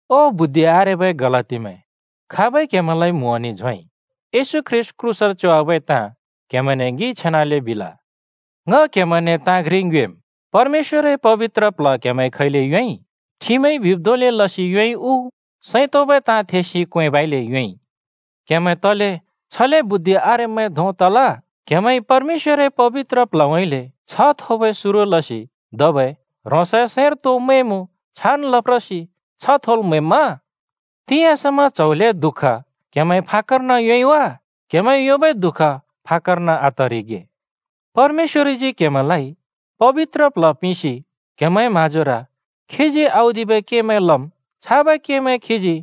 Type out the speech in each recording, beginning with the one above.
ओ बुद्धि आरेबै गलातीमैं! खाबइ क्‍हेमैंलाइ म्होंनि झोंइ? येशू ख्रीष्‍ट क्रूसर च्‍योवाबै ताँ क्हेमैंने ङिइ छेनाले बिल। ङ क्हेमैंने ताँ घ्रि ङ्योएम्: परमेश्‍वरए पबित्र प्ल्ह क्‍हेमैंइ खैले योंइ? ठिमइ बिब् धोंले लसि योंइ उ, सैं तोंबै ताँ थेसि क्वेंबइले योंइ? क्‍हेमैं तले छले बुद्धि आरेब्‍मैं धों तल? क्‍हेमैंइ परमेश्‍वरए पबित्र प्ल्हउँइँले छ्ह थोबै सुरु लसि धबै ह्रोंसए सैंर तो मैंमुँ छान् लप्रसि छ्ह थोल् म्‍हैम्‍मा? तिंयाँ समा च्‍हौ ल्‍हें दुःख क्‍हेमैंइ फाक्‍कर्न योंइ वा? क्हेमैंइ योंबै दुःख फाक्‍कर्न आतरिगे! परमेश्‍वरजी क्‍हेमैंलाइ पबित्र प्ल्ह पिंसि क्हेमैंए म्हाँजोर खीजी औदिबै केमैं लम्। छाबै केमैं खीजी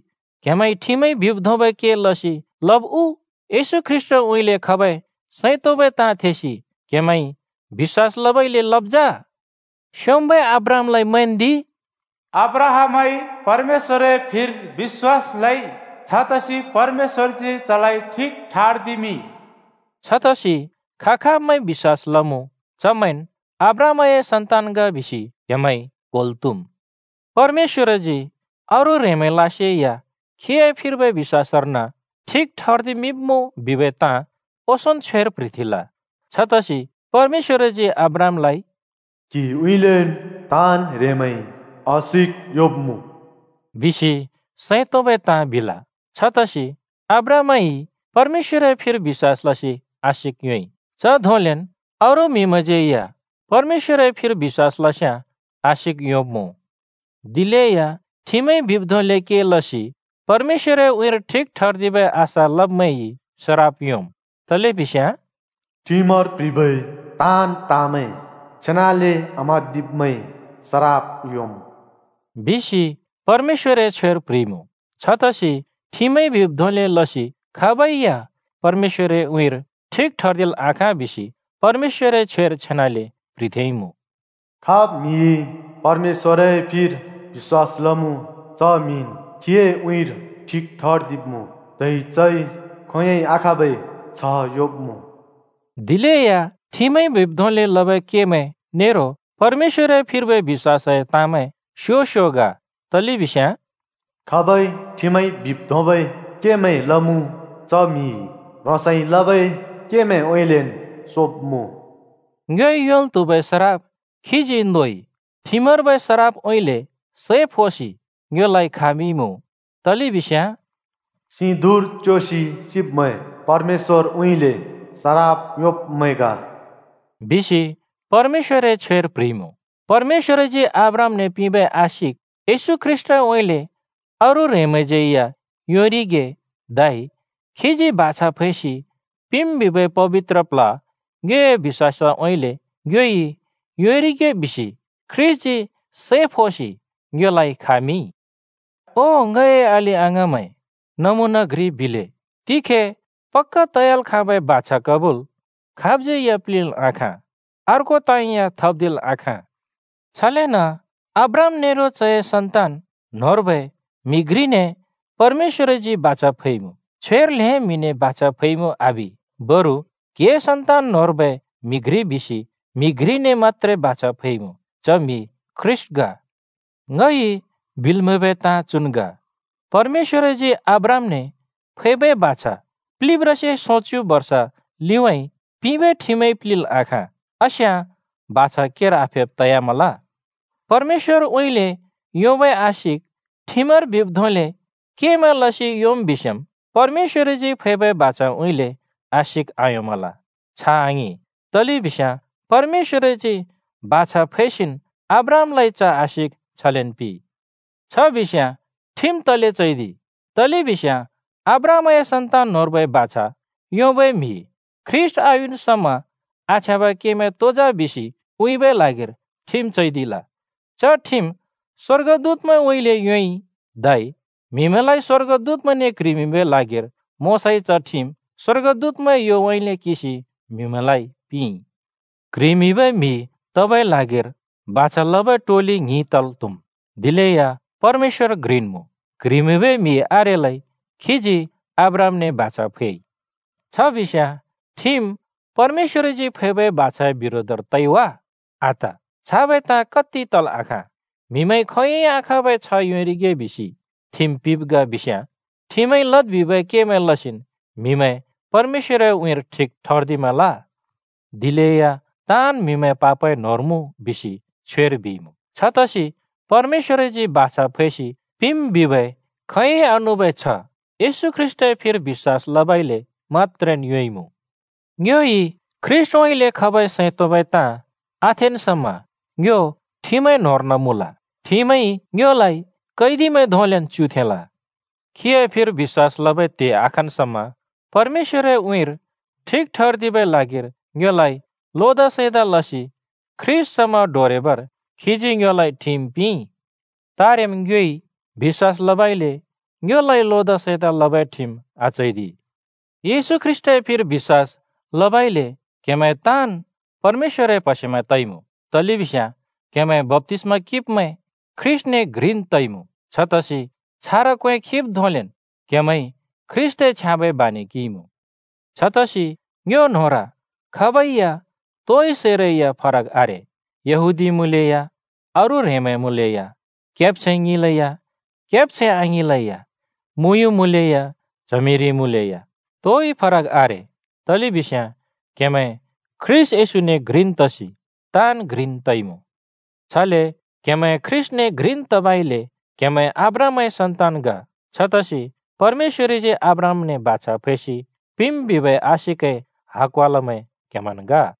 क्‍हेमैंइ ठिमइ बिब् धोंबै के लसि लब् उ, येशू ख्रीष्‍टउँइँले खबै सैं तोंबै ताँ थेसि क्हेमैंइ बिश्‍वास लबइले लब् जा? स्‍योंम्‍बै अब्राहामलाइ मैंन्दि। “अब्राहामइ परमेश्‍वरए फिर बिश्‍वास लइ, छतसि परमेश्‍वरजी चलाइ ठिक ठर्दिमिंइ।” छतसि खा-खाबमैंइ बिश्‍वास लमुँ, चमैंन् अब्राहामए सन्‍तान ग बिसि क्‍हेमैंइ क्होल् त्‍हुम्। परमेश्‍वरजी अरू ह्रेंमैंलासेया खीए फिर्बै बिश्‍वासर्न ठिक ठर्दिमिंब्‍मुँ बिबै ताँ ओंसोंन् छ्वेर प्ह्रिथेंल। छतसि परमेश्‍वरजी अब्राहामलाइ “क्‍हिउँइँलेन् ताँन् ह्रेंमैंइ आशिक योंब्‍मुँ” बिसि सैं तोंबै ताँ बिल। छतसि अब्राहामइ परमेश्‍वरए फिर बिश्‍वास लसि आशिक योंइ, च धोंलेन् अरू म्हिमैंज्यै या परमेश्‍वरए फिर बिश्‍वास लस्याँ आशिक योंब्मुँ। दिलेया ठिमइ बिब् धोंले के लसि परमेश्‍वरए उँइँर ठिक ठर्दिबै आशा लब्मैंइ सराप योंम्, तलेबिस्याँ “ठिमर प्‍ह्रिबै ताँन् ताँमैं छेनाले आम्हाँदिब्मैंइ सराप योंम्।” बिसि परमेश्‍वरए छ्वेर प्‍ह्रिइमुँ। छतसि ठिमइ बिब् धोंले लसि खाबै या परमेश्‍वरए उँइँर ठिक ठर्दिल् आखाँ बिसि परमेश्‍वरए छ्वेर छेनाले प्‍ह्रिथेंइमुँ: “खाब् म्‍हिइ परमेश्‍वरए फिर बिश्‍वास लमुँ, च म्‍हिन् खीए उँइँर ठिक ठर्दिब्मुँ, धै चइ खोंयोंइ आखाँबै छ्ह योंब्‍मुँ।” दिलेया ठिमइ बिब् धोंले लबै केमैं नेरो परमेश्‍वरए फिर्बै बिश्‍वासए ताँमैं स्यो स्यो ग, तलेबिस्याँ “खाबइ ठिमइ बिब् धोंबै केमैं लमुँ, च म्‍हि ह्रोंसइ लबै केमैंउँइँलेन् सोब्मुँ।” ङ्योइ योंल् त्हुबै सराप खीजी नोइ, ठिमर्बै सरापउँइँले सै फोसि ङ्योलाइ खामिंइमुँ। तलेबिस्याँ “सिं धुँर च्‍योसि सिब्मैं, परमेश्‍वरउँइँले सराप योंब्मैं ग,” बिसि परमेश्‍वरए छ्वेर प्‍ह्रिइमुँ। परमेश्‍वरजी अब्राहामने पिंबै आशिक येशू ख्रीष्‍टउँइँले अरू ह्रेंमैंज्यै या योंरिगे धै खीजी बाछा फैसि पिंम् बिबै पबित्र प्ल्ह ङ्योए बिश्‍वासउँइँले ङ्योइ योंरिगे बिसि ख्रीष्‍टजी सै फोसि ङ्योलाइ खामिंइ। ओ ङए अलि-अङाँमैं, नमुना घ्रि बिले: तिखे पक्‍का तयाल् खाँबै बाछा कबूल खाबज्यै या प्लिंल् आखाँ, अर्को ताँ या थप्दिल् आखाँ। छलेन अब्राहाम नेरो चए सन्‍तान न्होंर्बै म्हि घ्रिने परमेश्‍वरजी बाछा फैइमुँ। छ्वेर “ल्हें म्हिने बाछा फैइमुँ” आबि, बरु “क्‍हिए सन्‍तान न्होंर्बै म्हि घ्रि” बिसि म्‍हि घ्रिने मत्‍त्रे बाछा फैमुँ। च म्‍हि ख्रीष्‍ट ग। ङइ बिल् म्हैबै ताँ चुन् ग: परमेश्‍वरजी अब्राहामने फैबै बाछा प्लिब्रासे सोंच्‍यु बर्ष लिउँइँ पिंबै ठिमइ प्लिंल् आखाँ, आस्याँ बाछा केर आफेब् तयामल। परमेश्‍वरउँइँले योंबै आशिक ठिमर बिब् धोंले केमैं लसि योंम् बिस्‍याँम्, परमेश्‍वरजी फैबै बाछाउँइँले आशिक आयोंमल। छ आङिं, तलेबिस्याँ परमेश्‍वरजी बाछा फैसिन् अब्राहामलाइ च आशिक छलेन् पिंइ। छ बिस्‍याँ ठिम तले चैदिइ? तलेबिस्याँ अब्राहामए सन्‍तान न्होंर्बै बाछा योंबै म्‍हि ख्रीष्‍ट आयुन् समा आछ्याँबै केमैं तो जा बिसि उँइँबै ल्हागिर ठिम चैदिल। च ठिम स्‍वर्गदूतमैंउँइँले योंइ धै म्हिमैंलाइ स्‍वर्गदूतमैंने क्ह्रिमिंबै ल्हागिर मोशाइ च ठिम स्‍वर्गदूतमैंए योउँइँले किंसि म्हिमैंलाइ पिंइ। क्ह्रिमिंबै म्हि तबै ल्हागिर बाछा लबै टोलि ङ्हिं तल् त्हुम्, दिलेया परमेश्‍वर घ्रिन् मुँ। (क्ह्रिमिंबै म्हि आरेलै खीजी आब्रहामने बाछा फैइ)। छ बिस्‍याँ ठिम परमेश्‍वरजी फैबै बाछाए बिरोधर तइ वा? आत, छाबै ताँ कत्ति तल् आखाँ! म्हिमैंइ खोंयोंइ आखाँबै छ्ह योंरिगे बिसि ठिम पिंब् ग बिस्याँ, ठिमइ लद् बिबै केमैं लसिन् म्हिमैं परमेश्‍वरए उँइँर ठिक ठर्दिमल। दिलेया “ताँन् म्‍हिमैं पापए न्होंर मुँ” बिसि छ्वेइ बिइमुँ। छतसि परमेश्‍वरजी बाछा फैसि पिंम् बिबै खोंयोंइ आनुबै छ्ह येशू ख्रीष्‍टए फिर बिश्‍वास लबइले मत्‍त्रेन् योंइमुँ। ङ्योइ ख्रीष्‍टउँइँले खबै सैं तोंबै ताँ आथेन् समा ङ्यो ठिमए न्होंर्न मुँल। ठिमइ ङ्योलाइ कैदिमैं धोंलेन् च्‍युथेंल। खीए फिर बिश्‍वास लबै त्हे आखन् समा परमेश्‍वरए उँइँर ठिक ठर्दिबै ल्हागिर ङ्योलाइ लोदा-सैंदा लसि ख्रीष्‍ट समा डोरेबर खीजी ङ्योलाइ ठिम पिंइ। तारेम् ङ्योइ बिश्‍वास लबइले ङ्योलाइ लोदा-सैंदा लबै ठिम आचैदि। येशू ख्रीष्‍टए फिर बिश्‍वास लबइले क्‍हेमैं ताँन् परमेश्‍वरए प्हसेमैं तइमुँ, तलेबिस्याँ क्‍हेमैं बप्‍तिस्‍मा किंब्मैं ख्रीष्‍टने घ्रिन् तइमुँ। छतसि छारा क्‍वें खिब् धोंलेन क्हेमैंइ ख्रीष्‍टए छ्याँबै बानि किंइमुँ। छतसि ङ्यो न्होंर खाबै या तोइ सैरैया फरक आरे - यहूदीमैं मुँलेया, अरू ह्रेंमैं मुँलेया, केब्छैं ङिंलेया केब्छैं आङिंलेया, मुँयुँ मुँलेया च्हमिरि मुँलेया, तोइ फरक आरे। तलेबिस्याँ क्‍हेमैं ख्रीष्‍ट येशूने घ्रिन् तसि ताँन् घ्रिन् तइमुँ। छले क्‍हेमैं ख्रीष्‍टने घ्रिन् तबइले क्‍हेमैं अब्राहामए सन्‍तान ग। छतसि परमेश्‍वरजी अब्राहामने बाछा फैसि पिंम् बिबै आशिकए हकवालामैं क्‍हेमैंन् ग।